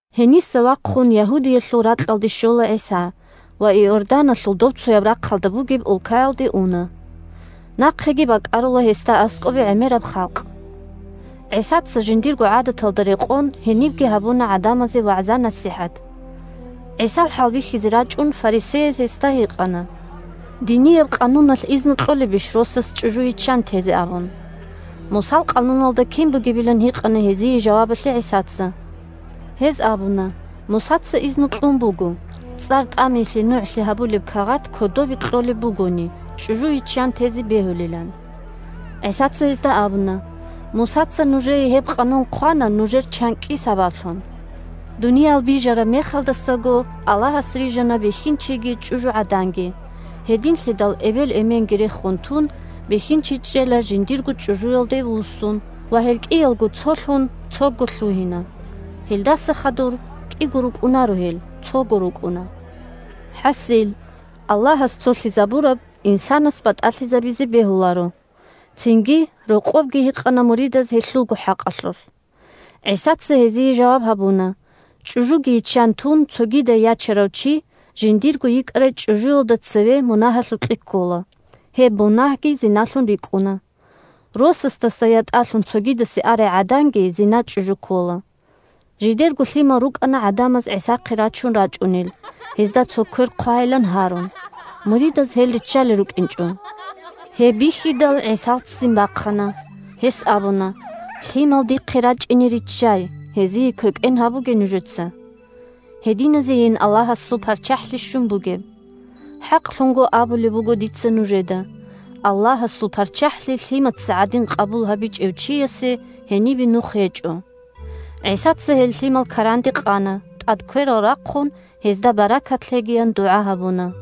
Гьениса вахъун Ягьудиялъул ракьалде щола ГӀиса ва Иорданалъул добцояб рахъалда бугеб улкаялде уна. Нахъеги бакӀарула гьесда аскӀобе гӀемераб халкъ. ГӀисаца, жиндирго гӀадаталда рекъон, гьенибги гьабуна гӀадамазе вагӀза-насихӀат. ГӀисал хӀалбихьизе рачӀун, фарисеяз гьесда гьикъана: – Динияб къануналъ изну кьолебищ росас чӀужу йиччан тезе? – абун. Мусал къануналда кин бугебилан гьикъана гьезие жавабалъе ГӀисаца. Гьез абуна: – Мусаца изну кьун буго, «цӀар тӀамиялъе нугӀлъи гьабулеб кагъат кодобе кьолеб бугони, чӀужу йиччан тезе бегьулилан». ГӀисаца гьезда абуна: – Мусаца нужее гьеб Къанун хъвана нужер чанкӀкӀи сабаблъун. Дуниял бижараб мехалдасаго Аллагьас рижана бихьинчиги чӀужугӀаданги. «Гьединлъидал эбел-эменги рехун тун, бихьинчи чӀела жиндирго чӀужуялде вуссун, ва гьел кӀиялго цолъун, цого лъугьина». Гьелдаса хадур кӀиго рукӀунаро гьел, цого рукӀуна. ХӀасил, Аллагьас цолъизабураб инсанас батӀалъизабизе бегьуларо. Цинги рокъобги гьикъана муридаз гьелъулго хӀакъалъулъ. ГӀисаца гьезие жаваб гьабуна: – ЧӀужуги йиччан тун, цогидай ячарав чи, жиндирго йикӀарай чӀужуялда цеве мунагьалъукье ккола. Гьеб мунагьги зиналъун рикӀкӀуна. Росасдаса ятӀалъун цогидасе арай гӀаданги зиначӀужу ккола. Жидерго лъимал рукӀана гӀадамаз ГӀисахъе рачун рачӀунел, гьезда цо квер хъвайилан гьарун. Муридаз гьел риччалел рукӀинчӀо. Гьеб бихьидал, ГӀисал ццин бахъана. Гьес абуна: – Лъимал дихъе рачӀине риччай, гьезие квекӀен гьабуге нужеца. Гьединазейин Аллагьасул ПарччахӀлъи щун бугеб! ХӀакълъун абулеб буго дица нужеда: Аллагьасул ПарччахӀлъи лъимаца гӀадин къабул гьабичӀев чиясе гьенибе нух гьечӀо. ГӀисаца гьел лъимал каранде къана, тӀад кверал рахъун, гьезда баркат лъегиян дугӀа гьабуна.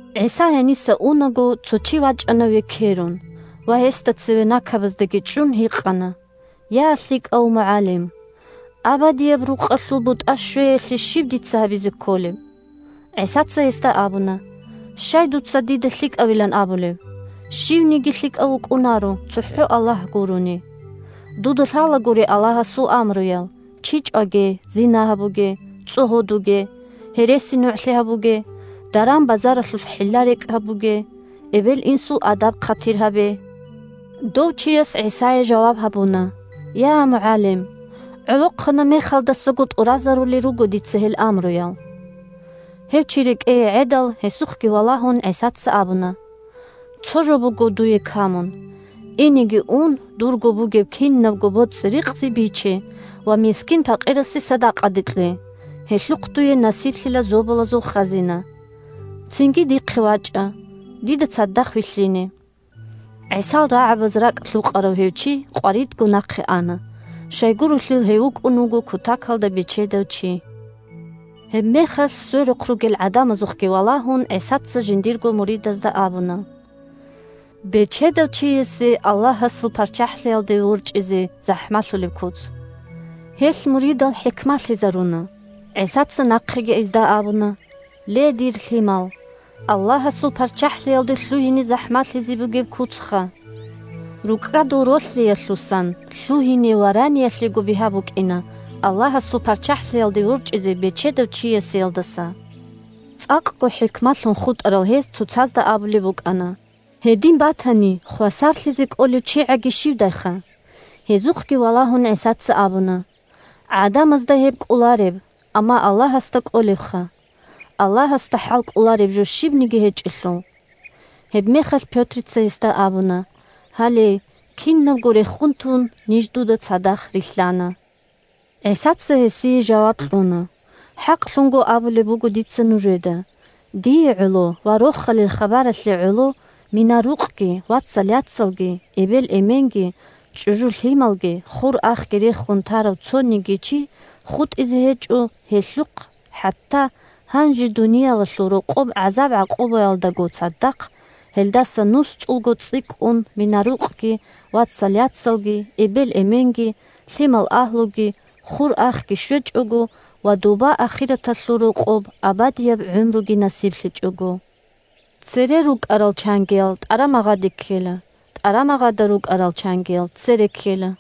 ГӀиса гьениса унаго, цо чи вачӀана векерун ва, гьесда цеве накабаздаги чӀун, гьикъана: – Я лъикӀав МугӀалим! Абадияб рукъалъул бутӀа щвеялъе щиб дица гьабизе кколеб? ГӀисаца гьесда абуна: – Щай дуца дида лъикӀавилан абулеб? Щивниги лъикӀав вукӀунаро, цохӀо Аллагь гурони! Дуда лъалагури Аллагьасул амруял: «чи чӀваге», «зина гьабуге», «цӀогьодуге», «гьересинугӀлъи гьабуге», «даран-базаралъулъ хӀилла-рекӀкӀ гьабуге», «эбел-инсул адаб-хъатир гьабе». Дов чияс ГӀисае жаваб гьабуна: – Я МугӀалим! ГӀолохъанаб мехалдасаго тӀуразарулел руго дица гьел амруял. Гьев чи рекӀее гӀедал, гьесухъги валагьун, ГӀисаца абуна: – Цо жо буго дуе камун: инеги ун, дурго бугеб кинабго боцӀи-рикъзи биче ва мискин-пакъирасе садакъаде кье, гьелъухъ дуе насиблъила зобалазул хазина. Цинги дихъе вачӀа, дида цадахъ вилълъине. ГӀисал рагӀабаз ракӀ лъукъарав гьев чи къваридго нахъе ана. Щайгурелъул гьев вукӀун вуго кутакалда бечедав чи. Гьебмехалъ сверухъ ругел гӀадамазухъги валагьун, ГӀисаца жиндирго муридазда абуна: – Бечедав чиясе Аллагьасул ПарччахӀлъиялде ворчӀизе захӀмалъулеб куц! Гьелъ муридал хӀикмалъизаруна. ГӀисаца нахъеги гьезда абуна: – Ле дир лъимал! Аллагьасул ПарччахӀлъиялде лъугьине захӀмалъизе бугеб куцха! РукӀкӀадул ролъиялъусан лъугьине вараниялъего бигьа букӀина, Аллагьасул ПарччахӀлъиялде ворчӀизе бечедав чиясеялдаса. ЦӀакъго хӀикмалъун хутӀарал гьез цоцазда абулеб букӀана: – Гьедин батани, хвасарлъизе кӀолев чигӀаги щивдайха? Гьезухъги валагьун, ГӀисаца абуна: – ГӀадамазда гьеб кӀолареб, амма Аллагьасда кӀолебха! Аллагьасда хӀалкӀолареб жо щибниги гьечӀелъул! Гьебмехалъ Пётрица гьесда абуна: – Гьале, кинабго рехун тун, ниж дуда цадахъ рилълъана… ГӀисаца гьесие жаваб кьуна: – ХӀакълъун абулеб буго дица нужеда: дие гӀоло ва Рохалил хабаралъе гӀоло мина-рукъги, вацал-яцалги, эбел-эменги, чӀужу-лъималги, хур-ахги рехун тарав цониги чи хутӀизе гьечӀо, гьелъухъ хӀатта гьанже дуниялалъул рокъоб гӀазаб-гӀакъубаялдаго цадахъ, – гьелдаса нусцӀулго цӀикӀкӀун мина-рукъги, вацал-яцалги, эбел-эменги, лъимал-агьлуги, хур-ахги щвечӀого, ва доба ахираталъул рокъоб абадияб гӀумруги насиблъичӀого. Цере рукӀарал чангиял тӀарамагъаде ккела, тӀарамагъада рукӀаразул чангиял цере ккела.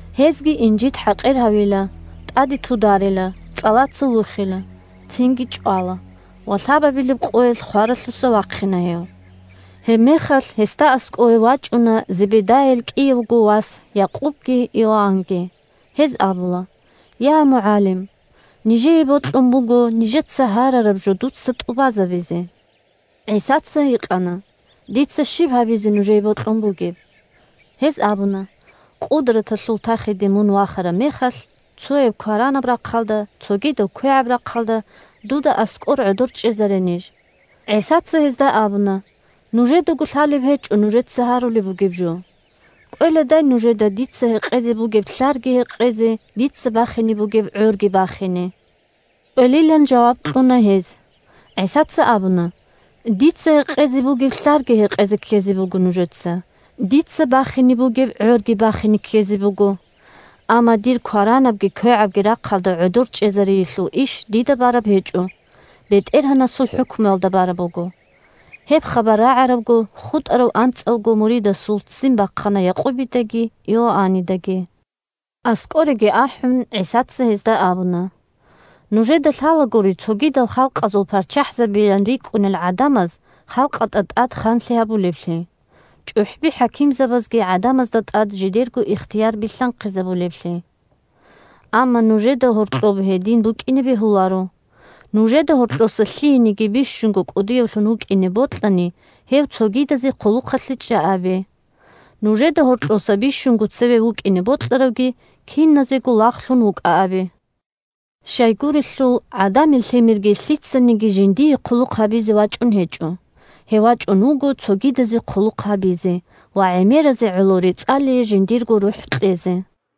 Гьезги инжит-хӀакъир гьавила, тӀаде тударила, цӀалаца вухила, цинги чӀвала ва лъабабилеб къоялъ хваралъуса вахъина гьев. Гьебмехалъ гьесда аскӀове вачӀуна Зебедайил кӀиявго вас – Якъубги Иоаннги. Гьез абула: – Я МугӀалим! Нижее бокьун буго нижеца гьарараб жо дуца тӀубазе. ГӀисаца гьикъана: – Дица щиб гьабизе нужее бокьун бугеб? Гьез абуна: – Къудраталъул тахиде мун вахараб мехалъ, цояв кваранаб рахъалда, цогидавги квегӀаб рахъалда, дуда аскӀор гӀодор чӀезаре ниж. ГӀисаца гьезда абуна: – Нужедаго лъалеб гьечӀо нужеца гьарулеб бугеб жо. КӀвеладай нужеда дица гьекъезе бугеб лълъарги гьекъезе, дица бахине бугеб гӀорги бахине? КӀвелилан жаваб кьуна гьез. ГӀисаца абуна: – Дица гьекъезе бугеб лълъарги гьекъезе ккезе буго нужеца, дица бахине бугеб гӀорги бахине ккезе буго. Амма дир кваранабги квегӀабги рахъалда гӀодор чӀезариялъул иш дида бараб гьечӀо, БетӀергьанасул хӀукмуялда бараб буго. Гьеб хабар рагӀарабго, хутӀарав анцӀавго муридасул ццин бахъана Якъубидаги Иоаннидаги. АскӀореги ахӀун, ГӀисаца гьезда абуна: – Нужеда лъалагури цогидал халкъазул парччахӀзабийилан рикӀкӀунел гӀадамаз халкъалда тӀад ханлъи гьабулеблъи, чӀухӀби-хӀакимзабазги гӀадамазда тӀад жидерго ихтияр билълъанхъизабулеблъи. Амма нужеда гьоркьоб гьедин букӀине бегьуларо. Нужеда гьоркьоса лъиениги бищунго кӀудиявлъун вукӀине бокьани, гьев цогидазе хъулухъалъе чӀа абе. Нужеда гьоркьоса бищунго цеве вукӀине бокьаравги киназего лагълъун вукӀа абе. Щайгурелъул ГӀадамил Лъимерги лъицаниги жиндие хъулухъ гьабизе вачӀун гьечӀо. Гьев вачӀун вуго цогидазе хъулухъ гьабизе ва гӀемеразе гӀоло рецӀалие жиндирго рухӀ кьезе.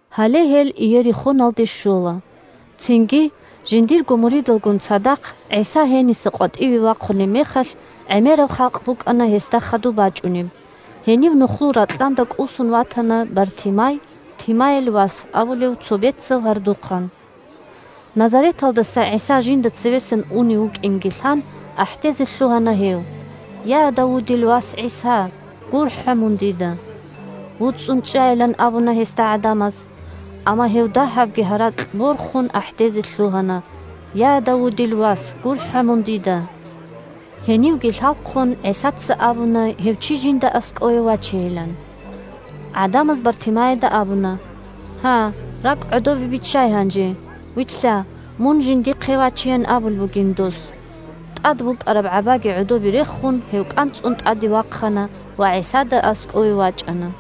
Гьале гьел Иерихоналде щола. Цинги, жиндирго муридалгун цадахъ ГӀиса гьениса къватӀиве вахъунеб мехалъ, гӀемераб халкъ букӀана гьесда хадуб бачӀунеб. Гьенив нухлул ракьанда кӀусун ватана Бартимай (Тимайил вас) абулев цо бецав гьардухъан. Назареталдаса ГӀиса жинда цевесан унев вукӀинги лъан, ахӀдезе лъугьана гьев: – Я, Давудил вас ГӀиса! ГурхӀа мун дида! ВуцӀцӀун чӀайилан абуна гьесда гӀадамаз. Амма гьев дагьабги гьаракь борхун ахӀдезе лъугьана: – Я, Давудил вас! ГурхӀа мун дида! Гьенивги лъалхъун, ГӀисаца абуна гьев чи жинда аскӀове вачейилан. ГӀадамаз Бартимайида абуна: – Гьа, ракӀ гӀодобе биччай гьанже! Вилълъа, мун жиндихъе вачеян абулеб бугин дос. ТӀад букӀараб гӀабаги гӀодобе рехун, гьев кӀанцӀун тӀаде вахъана ва ГӀисада аскӀове вачӀана.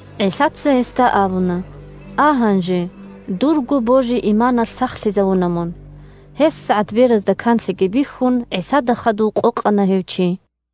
ГӀисаца гьесда абуна: – А гьанже. Дурго божи-иманалъ сахлъизавуна мун. ГьебсагӀат беразда канлъиги бихьун, ГӀисада хадув къокъана гьев чи.